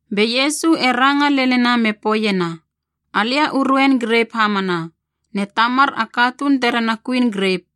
Be Iesu e ranga lenina me poeiena, “Alia u ruein grep hamana, ne Tamar a katuun terena kuin grep.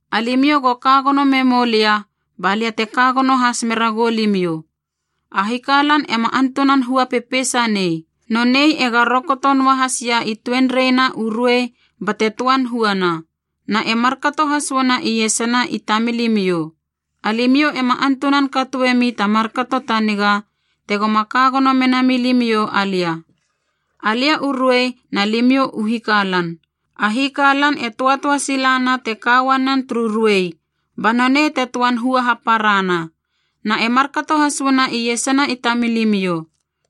Alimiou go ka gono memou lia ba lia te ka gono has mera goulimiou. A hikalan ema antunan hua pepeisa nei. Nonei ega rokoto noa hasia i tuenreina u ruei bate töan huana. Na e markato has uana iesana i tamilimiou. Alimiou ema antunan katoemi ta markato ta niga tegoma ka gono mena milimiou alia. “Alia u ruei na limiou u hikalan. A hikalan e töatöa sila na te ka uanen turu ruei, ba nonei te töan hua haparana. Na e markato has uana iesana i tamilimiou.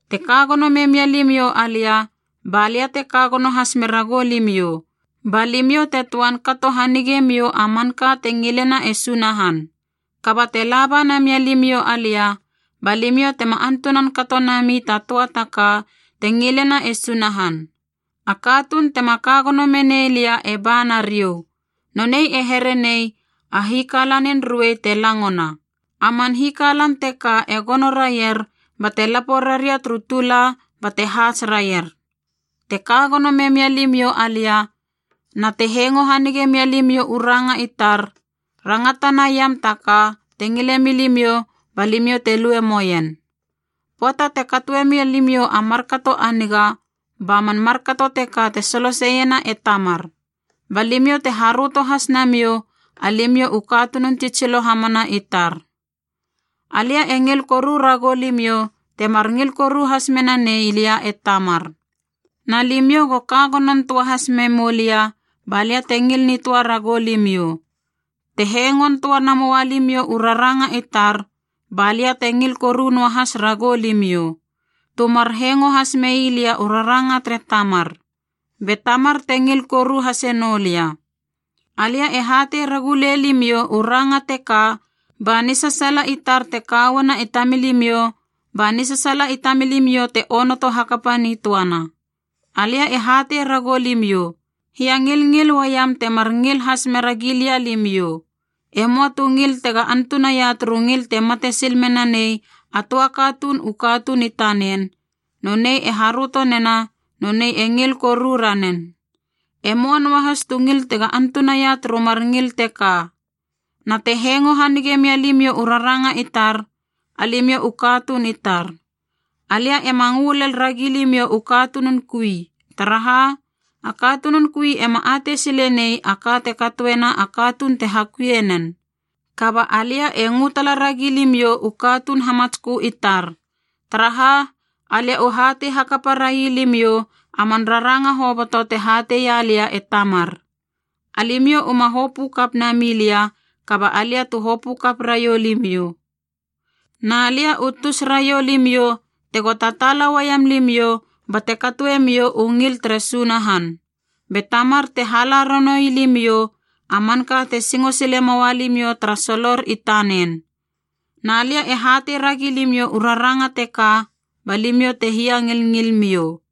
Te ka gono memia limiou alia balia teka gono has mera goulimiou, ba limiou te töan kato hanigemiou a manka te ngilena e Sunahan. Kaba te laba namia limiou alia, ba limiou tema antunan kato nami ta töa ta ka te ngilena e Sunahan. A katuun tema ka gono menei lia e ba nariou. Nonei e here nei a hikalanin ruei te langona. A man hikalan teka e gono raier bate lapo raria turu tula bate haats raier. Te ka gono memia limiou alia na te hengo hanige mia limiou u ranga i tar, rangata naiam ta ka te ngile milimiou ba limiou te lue moien. Pöata te katoe mia limiou a markato a niga ba man markato teka te soloseiena e Tamar, ba limiou te haröto has namiou alimiou u katunun tsitsilo hamana i tar. “Alia e ngil koru ragou limiou temar ngil koru has menanei lia e Tamar. Na limiou go ka gonon töa has memou lia ba lia te ngil nitöa ragou limiou. Te hengon töa namoua limiou u raranga i tar ba lia te ngil koru noahas ragou limiou, tu mar hengo has mei lia u raranga tere Tamar, be Tamar te ngil koru hase noulia. Alia e hatei ragu lei limiou u ranga teka ba nisasaala i tar te kauana i tamilimiou ba nisasaala i tamilimiou te onoto hakapa nitöana. Alia e hatei ragou limiou: hiangilngil uaiam temar ngil has mera gilia limiou. E möa tu ngil tega antunaia turu ngil te mate sil menanei a töa katuun u katuun i tanen, nonei e haröto nena nonei e ngil koru ranen. E möa noahas tu ngil tega antunaia turu mar ngil teka. Na te hengo hanige mia limiou u raranga i tar, alimiou u katuun i tar. Alia ema ngö lel ragi limiou u katunun kui, taraha a katunun kui ema atei sile nei a ka te katoena a katuun te hakuie nen. Kaba alia e ngö tala ragi limiou u katuun hamatskö i tar, taraha alia u hatei hakapa railimiou a man raranga hoboto te hateia lia e Tamar. Alimiou uma hopö kap nami lia kaba alia tu hopö kap raiou limiou. Na lia u tus raiou limiou tego tataala uaiam limiou bate katoe miou u ngil tere Sunahan. Be Tamar te hala ranoui limiou a manka te singo sile moua limiou tara solor i tanen. Na lia e hatei ragi limiou u raranga teka ba limiou te hia ngilngil miou.”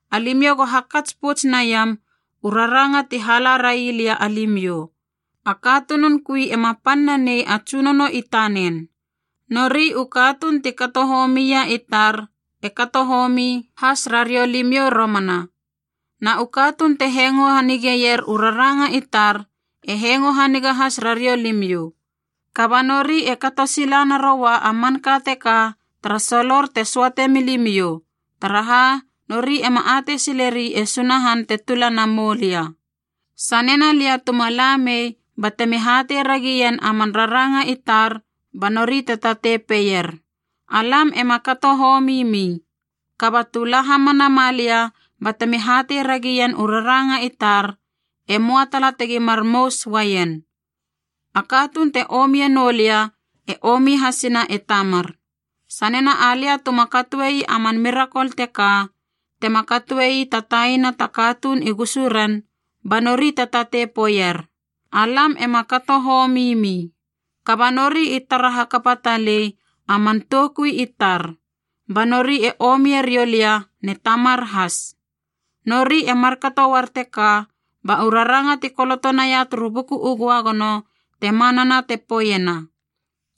Alimiou go hakats pouts naiam u raranga ti hala ra ii lia alimiou: a katunun kui ema pan nanei a tsunono i tanen. Nori u katuun ti kato homia i tar e kato homi has rariou limiou romana, na u katuun te hengo hanigeier u raranga i tar e hengo haniga has rariou limiou. Kaba nori e kato sila naroua a manka teka tara solor te söate milimiou, taraha nori ema atei sileri e Sunahan te tula na moulia. Sanena lia tuma la mei batemi hatei ragien a man raranga i tar, ba nori te tatei peier, ‘Alam ema kato homi mi.’ Kaba tu la hamana ma lia batemi hatei ragien u raranga i tar, e möa tala tegi mar mous uaien. A katuun te omie noulia e omi hasena e Tamar. Sanena alia tuma katoei a man mirakol teka, tema katoei ta taina ta katuun i gusu ren, ba nori te tatei poeier, ‘Alam ema kato homi mi.’ Kaba nori i tara hakapa talei a man toukui i tar, ba nori e omie riou lia ne Tamar has. Nori e markato uar teka ba u raranga ti koloto naia turu Buku u Göagono te manana te poeiena,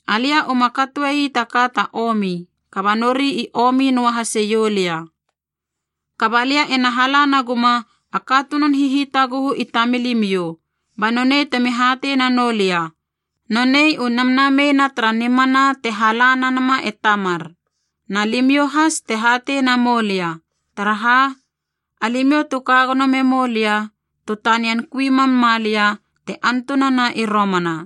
‘Alia uma katoi taka ta omi, kaba nori i omi noa haseiou lia.’ “Kaba lia ena hala na guma a katunun hihitaguhu i tamilimiou, ba nonei temi hatei nanou lia, nonei u Namnamei na tara nimana te hala na nama e Tamar. Na limiou has te hatei namou lia, taraha alimiou tu ka gono memou lia tu tanian kui mam ma lia te antunana i romana.”